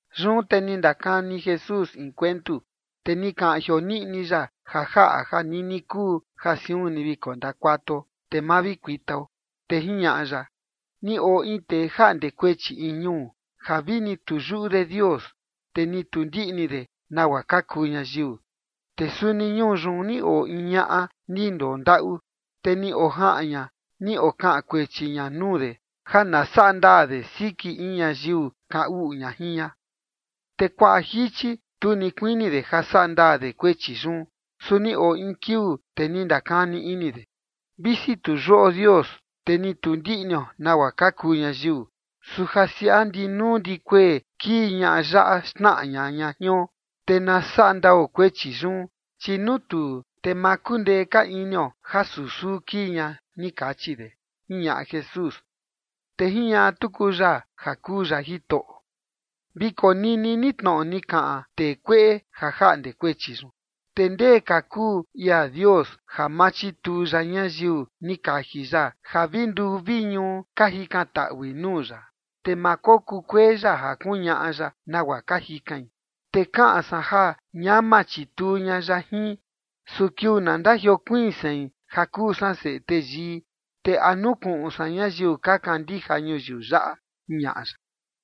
Yun te ni ndakani Jesús in kuentu, te ni kaꞌan jioniꞌni ya ja jaꞌa ja nini kuu ja siun ni vi kondakuatuo, te ma vi kuitao. Te jiñaꞌa ya: ―Ni oo in tee jaꞌnde kuechi in ñuu ja vini tu yuꞌu de Dios, te ni tu ndiꞌni de nagua ka kuu ñayiu. Te suni ñuu yun ni oo in ñaꞌa ni ndondaꞌu, te ni ojaꞌan ña ni okaꞌan kuechi ña nuu de ja na saꞌa ndaa de siki in ñayiu kaꞌan uꞌu jin ña. Te kuaꞌa jichi tu ni kuini de ja saꞌa ndaa de kuechi yun. Su ni oo in kiuu, te ni ndakani ini de: “Visi tu yuꞌo Dios, te ni tu ndiꞌnio nagua ka kuu ñayiu, su ja siaꞌa ndi nuu ndi kuee kii ñaꞌa yaꞌa xnaꞌa ña ña jion, te na saꞌa ndao kuechi yun, chi nuu tuu, te ma kundee ka inio ja susuu kii ña”, ni kachi de ―jiñaꞌa Jesús. Te jiñaꞌa tuku ya ja kuu ya Jitoꞌo: ―Vi konini ni tnoꞌo ni kaꞌan tee kueꞌe ja jaꞌnde kuechi yun. Te ndee ka kuu ia Dios ja ma chituu ya ñayiu ni kaji ya ja vi nduu vi ñuu ka jikantaꞌui nuu ya. Te ma kokukuee ya ja kuñaꞌa ya nagua ka jikain. Te kaꞌan san ja ñama chituu ña ya jin. Su kiuu na ndajiokuiin sein, ja kuu san Seꞌe Teyii, te ¿a nukuꞌun san ñayiu ka kandija ñuyiu yaꞌa? ―jiñaꞌa ya.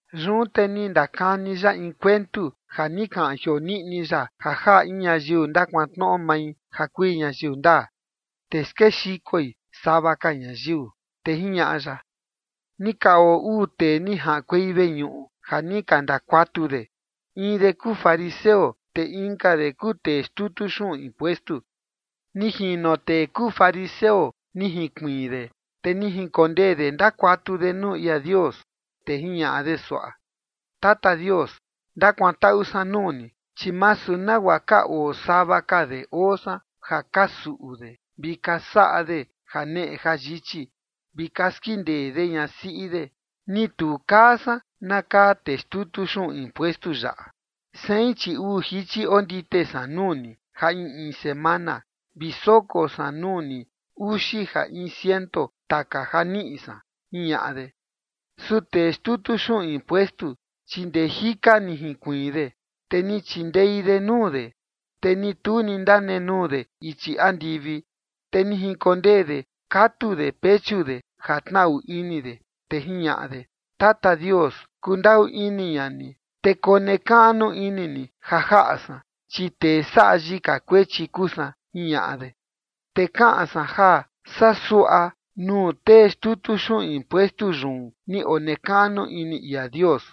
Yun te ni ndakani ya in kuentu ja ni kaꞌan jioniꞌni ya ja jaꞌa in ñayiu ndakuantnoꞌo mai ja kui ñayiu ndaa, te skexikoi sava ka ñayiu, te jiñaꞌa ya: ―Ni ka oo uu tee ni jaꞌankuei veñuꞌu ja ni ka ndakuatu de. In de kuu fariseo, te inka de kuu tee xtutu xuꞌun impuestu. Ni jino tee kuu fariseo ni jinkuiin de, te ni jinkondee de ndakuatu de nuu ia Dios, te jiñaꞌa de suaꞌa: “Tata Dios, ndakuantaꞌu san nuu ni, chi masu nagua ka oo sava ka de oo san ja ka suꞌu de, vi ka saꞌa de janeꞌe jayichi, vi ka skindee de ñasiꞌi de, ni tu kaa san na kaa tee xtutu xuꞌun impuestu yaꞌa. Sein, chi uu jichi ondite san nuu ni ja in in semana, vi soko san nuu ni uxi ja in ciento taka ja niꞌi san”, jiñaꞌa de. Su tee xtutu xuꞌun impuestu, chi ndee jika ni jinkuiin de, te ni chindei de nuu de, te ni tu ni ndanenuu de ichi andivi, te ni jinkondee de katu de pechu de ja tnaꞌu ini de, te jiñaꞌa de: “Tata Dios, kundaꞌu ini ña ni, te konekaꞌnu ini ni ja jaꞌa san, chi tee saꞌa yika kuechi kuu san”, jiñaꞌa de. Te kaꞌan san ja saa suaꞌa nuu tee xtutu xuꞌun impuestu yun ni onekaꞌnu ini ia Dios.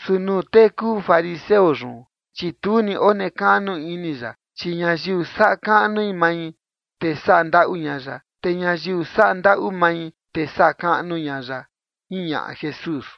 Su nuu tee kuu fariseo yun, chi tu ni onekaꞌnu ini ya. Chi ñayiu saꞌa kaꞌnu mai, te saꞌa ndaꞌu ña ya. Te ñayiu saꞌa ndaꞌu mai, te saꞌa kaꞌnu ña ya ―jiñaꞌa Jesús.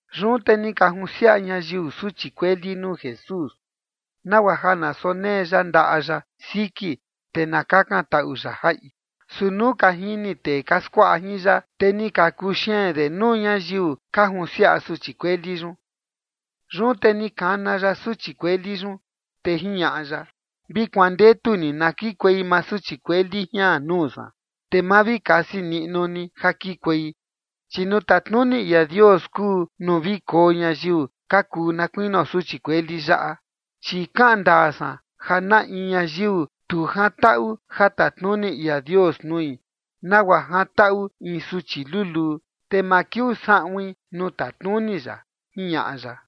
Yun te ni ka junsiaꞌa ñayiu suchi kueli nuu Jesús, nagua ja na sonee ya ndaꞌa ya siki, te na kakantaꞌu ya jaꞌi. Su nuu ka jini tee ka skuaꞌa jin ya, te ni ka kuxeen de nuu ñayiu ka junsiaꞌa suchi kueli yun. Yun te ni kana ya suchi kueli yun, te jiñaꞌa ya: ―Vi kuandetu ni na kikuei maa suchi kueli jian nuu san, te ma vi kasi niꞌnu ni ja kikuei, chi nuu tatnuni ia Dios kuu nuu vi koo ñayiu ka kuu na kuinio suchi kueli yaꞌa. Chi kaꞌan ndaa san ja na in ñayiu tu jantaꞌu ja tatnuni ia Dios nui nagua jantaꞌu in suchi luluu, te ma kiuu saꞌuin nuu tatnuni ya ―jiñaꞌa ya.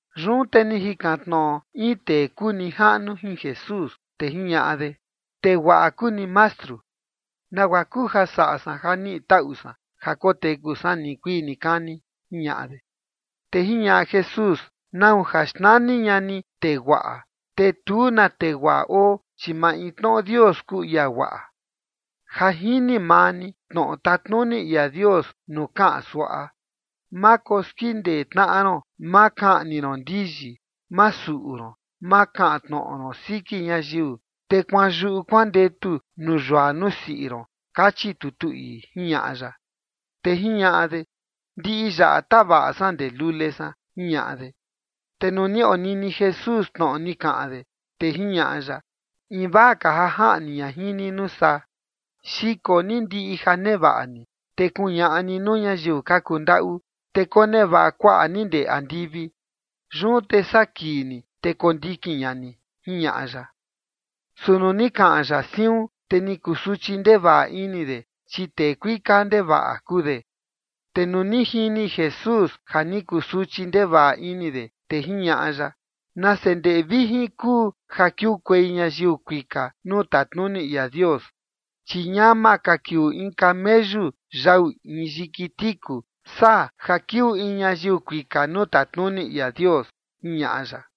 Yun te ni jikan tnoꞌo in tee kuu nijaꞌnu jin Jesús, te jiñaꞌa de: ―Tee guaꞌa kuu ni, Mastru. ¿Nagua kuu ja saꞌa san ja niꞌi taꞌu san ja koteku san nikuii nikani? ―jiñaꞌa de. Te jiñaꞌa Jesús: ―¿Nau ja xnani ña ni tee guaꞌa? Te tu na tee guaꞌa oo, chi maintnoꞌo Dios kuu ia guaꞌa. Ja jini maa ni tnoꞌo tatnuni ia Dios nuu kaꞌan suaꞌa: Ma koskindee tnaꞌa ron, ma kaꞌni ron ndiyi, ma suꞌu ron, ma kaꞌan tnoꞌo ron siki ñayiu, te kuanyuꞌu kuandetu nuu yua nuu siꞌi ron, kachi tutu ii ―jiñaꞌa ya. Te jiñaꞌa de: ―Ndiꞌi yaꞌa tavaꞌa san ndee lule san ―jiñaꞌa de. Te nuu ni onini Jesús tnoꞌo ni kaꞌan de, te jiñaꞌa ya: ―Invaa ka ja jaꞌni ña jin ni nuu saa: Xiko ni ndiꞌi ja nevaꞌa ni, te kuñaꞌa ni nuu ñayiu ka kundaꞌu, te konevaꞌa kuaꞌa ni ndee andivi. Yun te saa kii ni, te kondikin ña ni ―jiñaꞌa ya. Su nuu ni kaꞌan ya siun, te ni kusuchi ndevaꞌa ini de, chi tee kuika ndevaꞌa kuu de. Te nuu ni jini Jesús ja ni kusuchi ndevaꞌa ini de, te jiñaꞌa ya: ―Nase ndeꞌe vijin kuu ja kiukuei ñayiu kuika nuu tatnuni ia Dios. Chi ñama ka kiuu in kameyu yau in yiki tiku saa ja kiuu in ñayiu kuika nuu tatnuni ia Dios ―jiñaꞌa ya.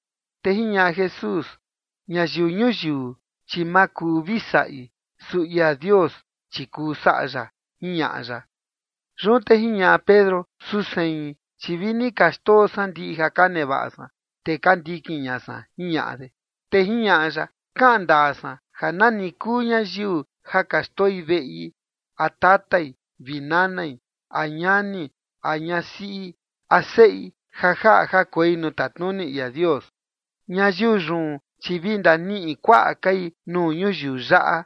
Te jiñaꞌa Jesús: ―Ñayiu ñuyiu, chi ma kuu vi saꞌi. Su ia Dios, chi kuu saꞌa ya ―jiñaꞌa ya. Yun te jiñaꞌa Pedro: ―Su sein, chi vi ni ka xndoo san ndiꞌi ja ka nevaꞌa san, te ka ndikin ña san ―jiñaꞌa de. Te jiñaꞌa ya: ―Kaꞌan ndaa san ja nani kuu ñayiu ja ka xndoi veꞌi, a tatai vi nanai, a ñani, a ñasiꞌi, a seꞌi ja jaꞌa ja koi nuu tatnuni ia Dios, ñayiu yun chi vi ndaniꞌi kuaꞌa kai nuu ñuyiu yaꞌa,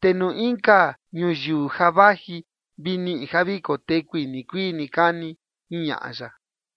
te nuu inka ñuyiu ja vaji, vi niꞌi ja vi kotekui nikuii nikani ―jiñaꞌa ya.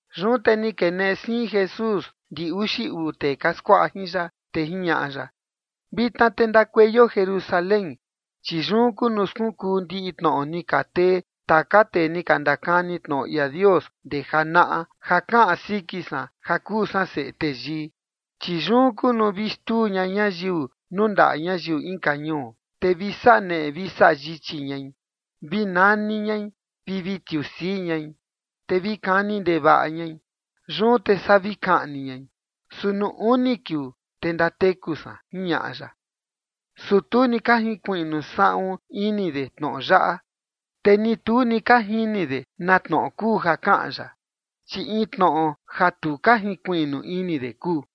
Yun te ni keneꞌe siin Jesús ndi uxi uu tee ka skuaꞌa jin ya, te jiñaꞌa ya: ―Vitna te ndakueio Jerusalén, chi yun kuu nuu skunkuu ndiꞌi tnoꞌo ni ka tee taka tee ni ka ndakani tnoꞌo ia Dios ndee janaꞌa, ja kaꞌan siki san ja kuu san Seꞌe Teyii. Chi yun kuu nuu vi xtuu ña ñayiu nuu ndaꞌa ñayiu inka ñuu, te vi saꞌa neꞌe vi saꞌa yichi ñai, vi nani ñai, vi vi tiusii ñai. Te vi kani ndevaꞌa ñai, yun te saa vi kaꞌni ñai. Su nuu uni kiuu, te ndateku san ―jiñaꞌa ya. Su tu ni ka jinkuiꞌnu saꞌun ini de tnoꞌo yaꞌa, te ni tu ni ka jini de na tnoꞌo kuu ja kaꞌan ya, chi in tnoꞌo ja tu ka jinkuiꞌnu ini de kuu.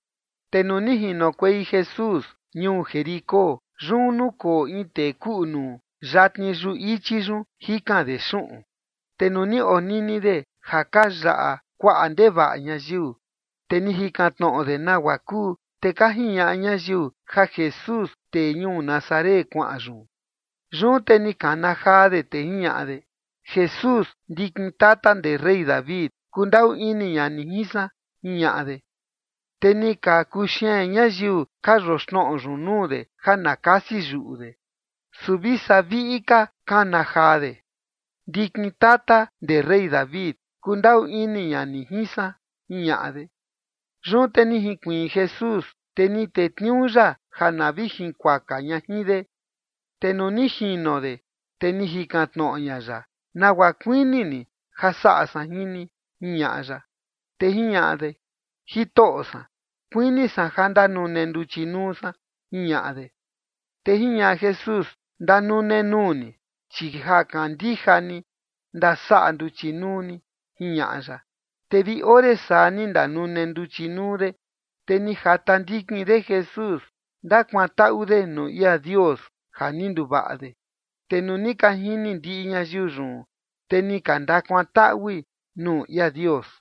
Te nuu ni jinokuei Jesús ñuu Jericó, yun nukoo in tee kuꞌu nuu yatni yuꞌu ichi yun jikan de xuꞌun. Te nuu ni onini de ja ka yaꞌa kuaꞌa ndevaꞌa ñayiu, te ni jikan tnoꞌo de nagua kuu. Te ka jiñaꞌa ñayiu ja Jesús, tee ñuu Nazaret, kuaꞌan yun. Yun te ni kana jaa de, te jiñaꞌa de: ―Jesús, ndikin tata ndee rey David, kundaꞌu ini ña ni jin san ―jiñaꞌa de. Te ni ka kuxeen ñayiu ka yoxnoꞌo yun nuu de ja na kasi yuꞌu de. Su vi saa viꞌi ka kana jaa de: ―Ndikin tata ndee rey David, kundaꞌu ini ña ni jin san ―jiñaꞌa de. Yun te ni jinkuiin Jesús, te ni tetniuu ya ja na vi jinkuaka ña jin de. Te nuu ni jino de, te ni jikan tnoꞌo ña ya: ―¿Nagua kuini ni ja saꞌa san jin ni? ―jiñaꞌa ya. Te jiñaꞌa de: ―Jitoꞌo san, kuini san ja ndanune nduchi nuu san ―jiñaꞌa de. Te jiñaꞌa Jesús: ―Ndanune nuu ni, chi ja kandija ni, ndasaꞌa nduchi nuu ni ―jiñaꞌa ya. Te vi ore saa ni ndanune nduchi nuu de, te ni jata ndikin de Jesús, ndakuantaꞌu de nuu ia Dios ja ni nduvaꞌa de. Te nuu ni ka jini ndiꞌi ñayiu yun, te ni ka ndakuantaꞌui nuu ia Dios.